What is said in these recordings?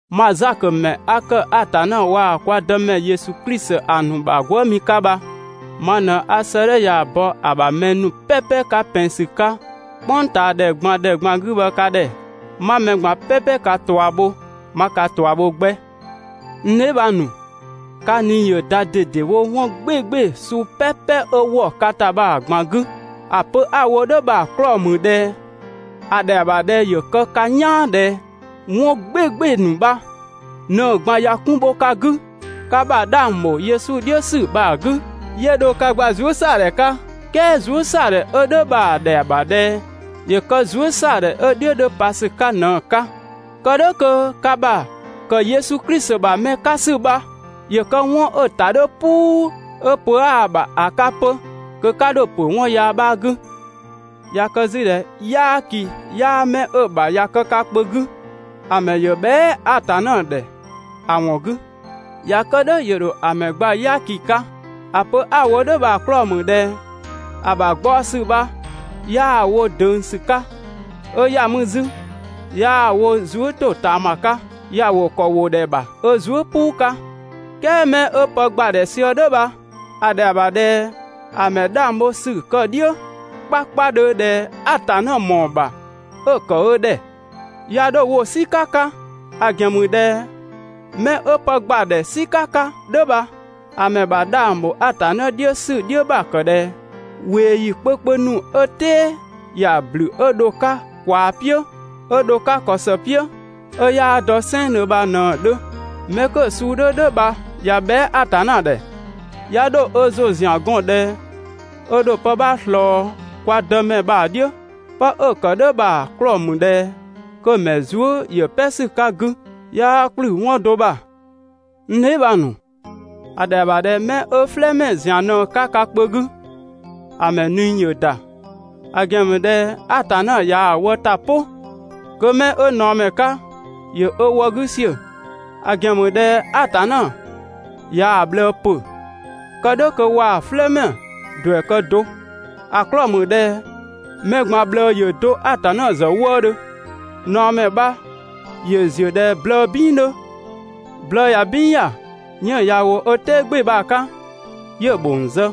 Mang Zakö ‑mɛ 'a ‑kë Atanna waa‑ kwa Dëmɛ Yesu Klisi ‑a ‑nu ‑bha gwëëmi 'ka bha, ma ꞊në 'a 'sëëdhɛ ya‑ bɔ ‑a ‑bha mɛ ‑nu "pɛpɛ 'ka ‑pɛn ‑sü 'ka "kpʋngtaadhɛ ꞊gban ‑dhɛ ꞊gban 'gü bha ka ‑dhɛ. 'Ma mɛ ꞊gban "pɛpɛ ka ꞊tua bho, 'ma ka ꞊tua bho 'gbɛ. N dheebhang ‑nu, ka ꞊nii ‑yö ‑da ꞊dedewo 'wɔn "gbɩɩgbɩɩ‑ suu "pɛpɛ 'ö ‑wɔ ka ‑ta bha‑ ꞊gban 'gü. ‑A pö 'a‑ wo "dhʋ̈ bha‑ 'klɔɔ‑ ‑mü ꞊dhɛ ‑a ‑dhɛa ‑bha ꞊dhɛ ‑yö kë ka "yaan ꞊dhɛ 'wɔn "gbɩɩgbɩɩ‑ ‑nu bha ꞊në‑ ꞊gban ꞊ya 'kun bho ka 'gü ka ‑bha 'dhang ‑bho Yesu "dhiʋ̈ ‑sü bha‑ 'gü, 'yö dho ka gba zuësɛadhɛ 'ka. "Kɛɛ zuësɛadhɛ 'ö "dhʋ̈ bha‑ ‑dhɛa ‑bha ꞊dhɛ ‑yö kë zuësɛadhɛ 'ö‑ "dhiʋ̈ 'dhö pa ‑sü 'ka ꞊në‑ 'ka, kë "dhʋ̈ kö ka ‑bha ‑kë Yesu Klisi ‑bha mɛ 'ka ‑sü bha ‑yö kë 'wɔn ‑ta "puu 'ö pö 'aa‑ ‑bha ‑a 'ka 'pö, kö 'ka 'dho ‑pö 'wɔn yaa 'bha 'gü. ꞊Ya kë 'zü ꞊dhɛ "yaaki 'yaa 'mɛ 'ö‑ ‑bha ꞊ya kë ka kpö 'gü, ‑a ‑mɛ ‑yö bhɛa" Atanna ‑dhɛ ‑a ‑wɔn 'gü, ꞊ya kë "dhʋ̈ ‑yö ‑dho ‑a ‑mɛ gba "yaaki 'ka. ‑A pö 'a‑ wo "dhʋ̈ bha‑ 'klɔɔ‑ ‑mü ꞊dhɛ ‑a ‑bha gbaɔ ‑sü bha 'yaa‑ wo ꞊döng ‑sü 'ka, 'ö ‑ya mü 'zü 'yaa‑ wo zuë" ‑totaama 'ka, ‑ya ‑wo ‑kɔ ‑wo ‑dhɛ ‑bha ö zuë" "puu 'ka. "Kɛɛ 'mɛ 'ö pë ‑gbadhɛ sië "dhʋ̈ bha, ‑a ‑dhɛa ‑bha ꞊dhɛ ‑a ‑mɛ 'dhang bho ‑sü kë‑ "dhiʋ̈ 'kpakpadhö ꞊dhɛ Atanna ‑mɔɔ ‑bha 'ö‑ ‑kë ö ‑dhɛ. 'Ya 'dho‑ wo "sika 'ka, ‑a ‑gɛn ‑mü ꞊dhɛ 'mɛ 'ö pë ‑gbadhɛ "sika 'ka "dhʋ̈ bha, ‑a ‑mɛ ‑bha 'dhang ‑bho Atanna "dhiʋ̈ ‑sü "dhiʋ̈ ‑bha ‑kë ꞊dhɛ ꞊weeyi kpökpö ‑nu 'ö "tɛɛ ‑ya ‑blü 'ö dho‑ 'ka ꞊kwaa "piʋ̈, 'ö dho‑ 'ka ‑kɔ ‑së "piʋ̈, 'ö 'yaa dɔ "sɛnngdhö bha ꞊në‑ 'dhö. 'Mɛ 'kö‑ suu 'dhö "dhʋ̈ bha ꞊ya bhɛa" Atanna ‑dhɛ, 'ya 'dho ö ‑zʋ ‑zian 'gɔn ꞊dhɛ 'ö ‑dho pë 'bha ꞊slɔɔ kwa Dëmɛ bha‑ "dhiʋ̈. 'Pë 'ö‑ ‑kë "dhʋ̈ bha‑ 'klɔɔ‑ ‑mü ꞊dhɛ kö‑ ‑mɛ zuë" ‑yö "pɛ ‑sü 'ka‑ 'gü, 'yaa ‑kplü 'wɔn do ‑bha. N dheebhang ‑nu, ‑a ‑dhɛa ‑bha ꞊dhɛ 'mɛ 'ö "flɛɛmɛ ‑zian ꞊në‑ 'ka (ka kpö 'gü), ‑a ‑mɛ ꞊nii ‑yö ‑da, ‑a ‑gɛn ‑mü ꞊dhɛ Atanna ꞊yaa‑ wë ‑ta "pʋ, kö 'mɛ 'ö ꞊naɔmɛ 'ka ‑yö ö wë 'gü ‑siö, ‑a ‑gɛn ‑mü ꞊dhɛ Atanna ꞊yaa‑ ꞊bhlëë ‑pö (kë "dhʋ̈ kö waa‑ "flɛɛmɛ ‑duɛ kë do. ‑A 'klɔɔ‑ ‑mü ꞊dhɛ mɛ ꞊gban ꞊bhlëë ‑yö do Atanna ‑zë wëëdhö). ꞊Naɔmɛ bha ‑yö ‑ziö ꞊dhɛ blëë "bin 'dhö. Blëë ꞊ya "bin ‑ya, 'yënng‑ ꞊ya ‑wo ö "tɛɛ "gbɩɩ‑ bha‑ 'ka, 'yö‑ ‑bhong zë,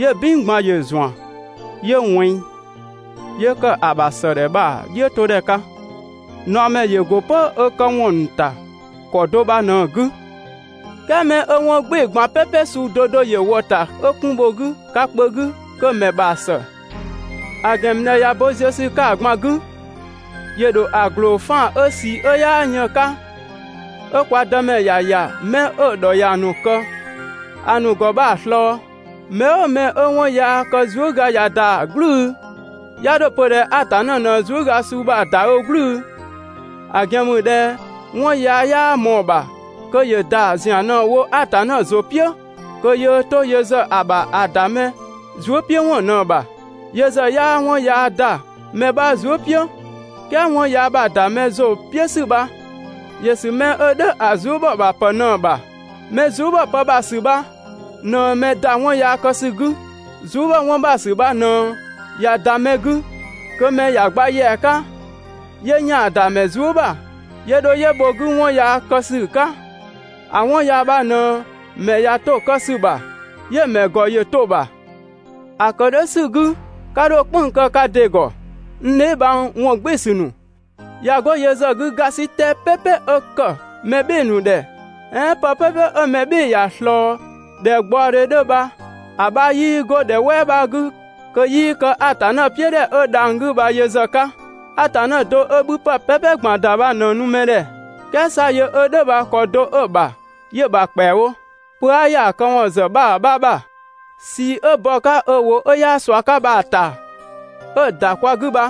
'yö‑ "bin ꞊gban ‑yö ‑zuan, 'yö ꞊wɛnng, 'yö ‑kë ‑a ‑bha ‑sëdhɛ bha‑ "dhiʋ̈todhɛ 'ka. ꞊Naɔmɛ ‑yö ‑go 'pö ö këwɔn ‑nu ‑ta ‑kɔ do bha ꞊në‑ 'gü. "Kɛɛ 'mɛ 'ö 'wɔn "gbɩɩ‑ ꞊gban "pɛpɛ suu 'do 'do ‑yö ‑wɔ ‑ta 'ö 'kun bho‑ 'gü (ka kpö 'gü), kö‑ ‑mɛ ‑bha ‑së, ‑a ‑gɛn ‑mü ꞊dhɛ ꞊ya bo ziö ‑sü 'ka‑ ꞊gban 'gü, ‑yö ‑dho ‑a ‑gloo 'faan‑ 'ö ꞊sii 'ö 'yaa yën‑ 'ka, 'ö kwa Dëmɛ ‑ya ‑ya 'mɛ 'ö‑ ‑dhɔ ‑ya ‑nu ‑kë ‑a ‑nu ‑gɔ bha‑ ꞊slɔɔ. Mɛ "ʋʋ mɛ 'ö 'wɔn yaa kë zuëga ꞊ya ‑da "gblʋ̈ʋ̈‑, 'ya 'dho‑ pö ꞊dhɛ Atanna ꞊në zuëga suu bha‑ ‑da ö "gblʋ̈ʋ̈‑, ‑a ‑gɛn ‑mü ꞊dhɛ 'wɔn yaa 'yaa ꞊mɔɔ‑ ‑bha kö ‑yö ‑da ‑zian ꞊në‑ wo Atanna ‑zʋ "piʋ̈ kö yöö 'to yö ‑zë ‑a ‑bha ‑a ‑da mɛ 'bha zuëpiʋ̈wɔn ꞊në‑ ‑bha. Yö ‑zë 'yaa 'wɔn yaa ‑da mɛ 'bha zuë" "piʋ̈. "Kɛɛ 'wɔn yaa ‑bha ‑da mɛ ‑zʋ "piʋ̈ ‑sü bha ‑yö ‑sü 'mɛ 'ö "dhʋ̈ ‑a zuë" ‑bhɔ ‑bha ‑pë ꞊në‑ ‑bha. Mɛ zuë" ‑bhɔ pë ‑bha ‑sü bha ꞊në mɛ ‑da 'wɔn yaa kë ‑sü 'gü. Zuë" ‑bhɔ 'wɔn ‑bha ‑sü bha ꞊në ꞊ya ‑da mɛ 'gü, kö mɛ ‑ya gba ‑yɛa 'ka, 'yö ‑yaan ‑da mɛ zuë" ‑bha, 'yö dho 'yö bho‑ 'gü 'wɔn yaa kë ‑sü 'ka. ‑A 'wɔn yaa bha ꞊në mɛ ꞊ya 'to‑ kë ‑sü ‑bha, 'yö‑ ‑mɛ ‑gɔ ‑yö to‑ ‑bha. ‑A ‑kë "dhʋ̈ ‑sü 'gü 'ka 'dho "kpënng‑ kë ka ‑dɩ ‑gɔ, n dheebhang ‑wɔngbɩɩsü ‑nu. ꞊Ya 'go yö ‑zë 'gü ‑gasitɛ "pɛpɛ 'ö ‑kë mɛ "bhɩɩ‑ ‑nu ‑dhɛ, "ɛɛn pë "pɛpɛ 'ö mɛ "bhɩɩ‑ ‑ya ꞊slɔɔ ꞊dhɛ gbaɔdhe 'dhö bha, ‑a 'bha 'yii 'go ‑dhɛ "wɛɛ 'bha 'gü kö 'yii kë Atanna "piʋ̈ ‑dhɛ 'ö dhang‑ 'gü bha yö ‑zë 'ka. Atanna do 'ö 'bhüpë "pɛpɛ ꞊gban ‑da bha ꞊në‑ nu mɛ ‑dhɛ. "Kɛɛ 'sa yö 'ö "dhʋ̈ bha ‑kɔ do 'ö‑ ‑bha 'yö‑ ‑bha ‑kpɛawo. Pö 'aa ‑ya ‑a këwɔn ‑zë 'bha ‑bha 'bha ‑bha. ꞊Sii 'ö bɔ‑ 'ka ö ‑wʋ 'ö 'yaa ꞊sua 'ka bha‑ ‑ta 'ö‑ ‑da kwa 'gü bha,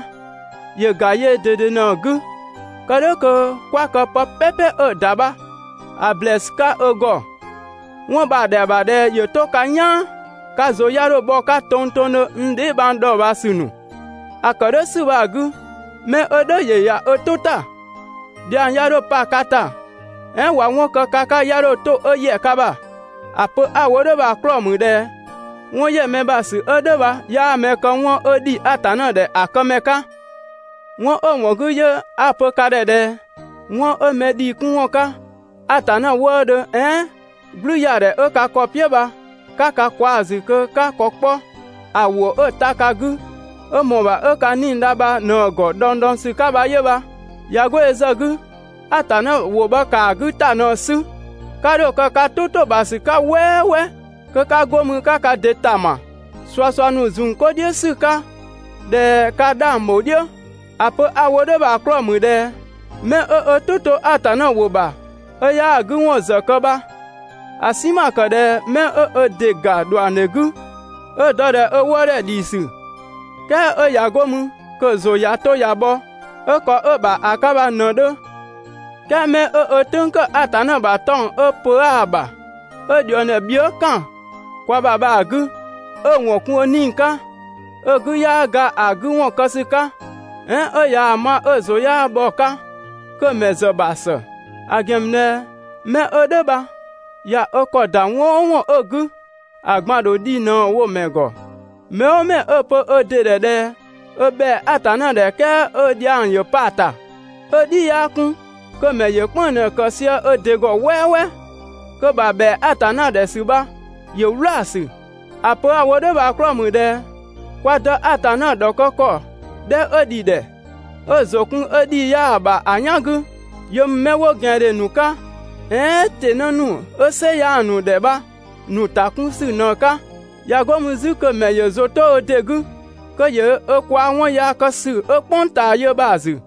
‑yö ‑ga yöö ꞊dede ꞊në‑ 'gü. Kë "dhʋ̈ kö 'kwa kë pë "pɛpɛ 'ö‑ ‑da bha‑ ‑blɛɛsü 'ka ö ‑gɔ. 'Wɔn bha‑ ‑dhɛa ‑bha ꞊dhɛ ‑yö 'to ka "yaan, ka ‑zʋ 'ya 'dho bhɔ‑ 'ka tongtongdhö, n dheebhang dhɔɔbhaasü ‑nu. ‑A ‑kë "dhʋ̈ ‑sü bha‑ 'gü, mɛ 'ö "dhʋ̈ ‑yö ‑ya ö "tʋ ‑ta, dhiang 'ya 'dho pa ka ‑ta, "ɛɛn ꞊wa 'wɔn kë ka 'ka 'ya 'dho 'to 'ö ‑yɛ ka ‑bha. ‑A pö 'a‑ wo "dhʋ̈ bha‑ 'klɔɔ‑ ‑mü ꞊dhɛ 'wɔn ‑yɛ mɛ ‑bha ‑sü 'ö "dhʋ̈ bha 'yaa mɛ kë 'wɔn 'ö ‑dhi Atanna ‑dhɛ ‑a këmɛ 'ka. 'Wɔn 'ö‑ ‑wɔn 'gü 'yö 'a‑ pö ka ‑dhɛ ꞊dhɛ 'wɔn 'ö mɛ ‑dhii 'kun ‑wɔn 'ka Atanna wëëdhö, "ɛɛn "gblüyaadhɛ 'ö ka ‑kɔ "piʋ̈ bha 'ka ka kwaa‑ ‑zü kö 'ka ka ‑kɔ 'kpɔ ‑a ‑wʋ 'ö‑ ta ka 'gü, 'ö ꞊mɔɔ‑ ‑bha 'ö ka 'nii‑ dha bha ꞊në‑ ‑gɔ dhɔngdhɔngsü 'ka bha 'yö bha. ꞊Ya 'go yö ‑zë 'gü, Atanna ‑wʋ bha ‑kaa 'gü ‑ta ꞊në‑ 'sü, 'ka 'dho‑ kë ka "tʋ ‑to ‑bha ‑sü 'ka "wɛɛwɛɛ kö 'ka 'go mü 'ka ka ‑dɩ ‑tama ꞊suasua ‑nu ‑zun 'ko "dhiʋ̈ ‑sü 'ka (꞊dhɛ ka 'dhang ‑bho "dhiʋ̈). ‑A pö 'a‑ wo "dhʋ̈ bha‑ 'klɔɔ‑ ‑mü ꞊dhɛ 'mɛ 'ö ö "tʋ 'to Atanna ‑wʋ ‑bha 'ö 'yaa‑ 'gü ‑wɔn ‑zë kë bha, ‑a "sinma ‑kë ꞊dhɛ 'mɛ 'ö ö ‑dɩ ‑ga ‑dhuangdhe 'gü 'ö‑ dɔ ꞊dhɛ ö wëëdhɛ ‑dhiisü, "kɛɛ 'ö ꞊ya 'go mü kö‑ ‑zʋ ꞊ya 'to ꞊ya bhɔ 'ö ‑kɔ 'ö‑ ‑bha ‑a 'ka bha ꞊në‑ 'dhö. "Kɛɛ mɛ 'ö ö "tʋ̈ng ‑kë Atanna ‑bha 'tɔng‑ 'ö pö 'aa‑ ‑bha, 'ö ꞊dhuëngdhɛ bhië" ‑kan kwa ‑bha bha‑ 'gü, 'ö‑ ‑wɔn kun ö 'nii‑ 'ka, 'ö‑ 'gü 'yaa ga ‑a 'gü ‑wɔn kë ‑sü 'ka, "ɛɛn 'ö ꞊yaa‑ ma 'ö‑ ‑zʋ 'yaa bhɔ‑ 'ka, kö‑ ‑mɛ ‑zë ‑bha ‑së. ‑A ‑gɛn ‑mü ꞊dhɛ 'mɛ 'ö "dhʋ̈ bha ꞊ya ö ‑kɔ ‑da 'wɔn "ʋʋ 'wɔn 'ö‑ 'gü, ‑a ꞊gban‑ ‑dho dhi ꞊në‑ wo‑ ‑mɛ ‑gɔ. Mɛ "ʋʋ mɛ 'ö‑ pö ö ‑dɩ ‑dhɛ ꞊dhɛ ö ‑bhɛa Atanna ‑dhɛ "kɛɛ 'ö dhiang ‑yö pa‑ ‑ta, 'ö‑ "dhi 'yaa 'kun, kö‑ ‑mɛ ‑yö "kpënng‑ ꞊në‑ kë sië ö ‑dɩ ‑gɔ "wɛɛwɛɛ, kö‑ ‑bha ‑bhɛa Atanna ‑dhɛ ‑sü bha ‑yö "wlaasü. ‑A pö 'a‑ wo "dhʋ̈ bha‑ 'klɔɔ‑ ‑mü ꞊dhɛ kwa Dë Atanna ‑dhɔkë ‑kɔ 'dhɛ 'ö ‑dhi ‑dhɛ, 'ö‑ ‑zʋ kun 'ö ‑dhii 'yaa‑ ‑bha ‑a "yan 'gü, yö ‑mü 'mɛ 'wo ꞊gɛandhe ‑nu 'ka "ɛɛn ‑tɩnë ‑nu 'ö "sɩ 'yaa‑ ‑nu ‑dhɛ bha‑ ‑nu ‑ta 'kun ‑sü ꞊në‑ 'ka. ꞊Ya 'go mü 'zü kö‑ ‑mɛ ‑yö ‑zʋ 'to ö ‑dɩ 'gü, kö ‑yö ö kwaa‑ 'wɔn yaa kë ‑sü 'ö "kpʋng ꞊taa yö bha‑ ‑zü.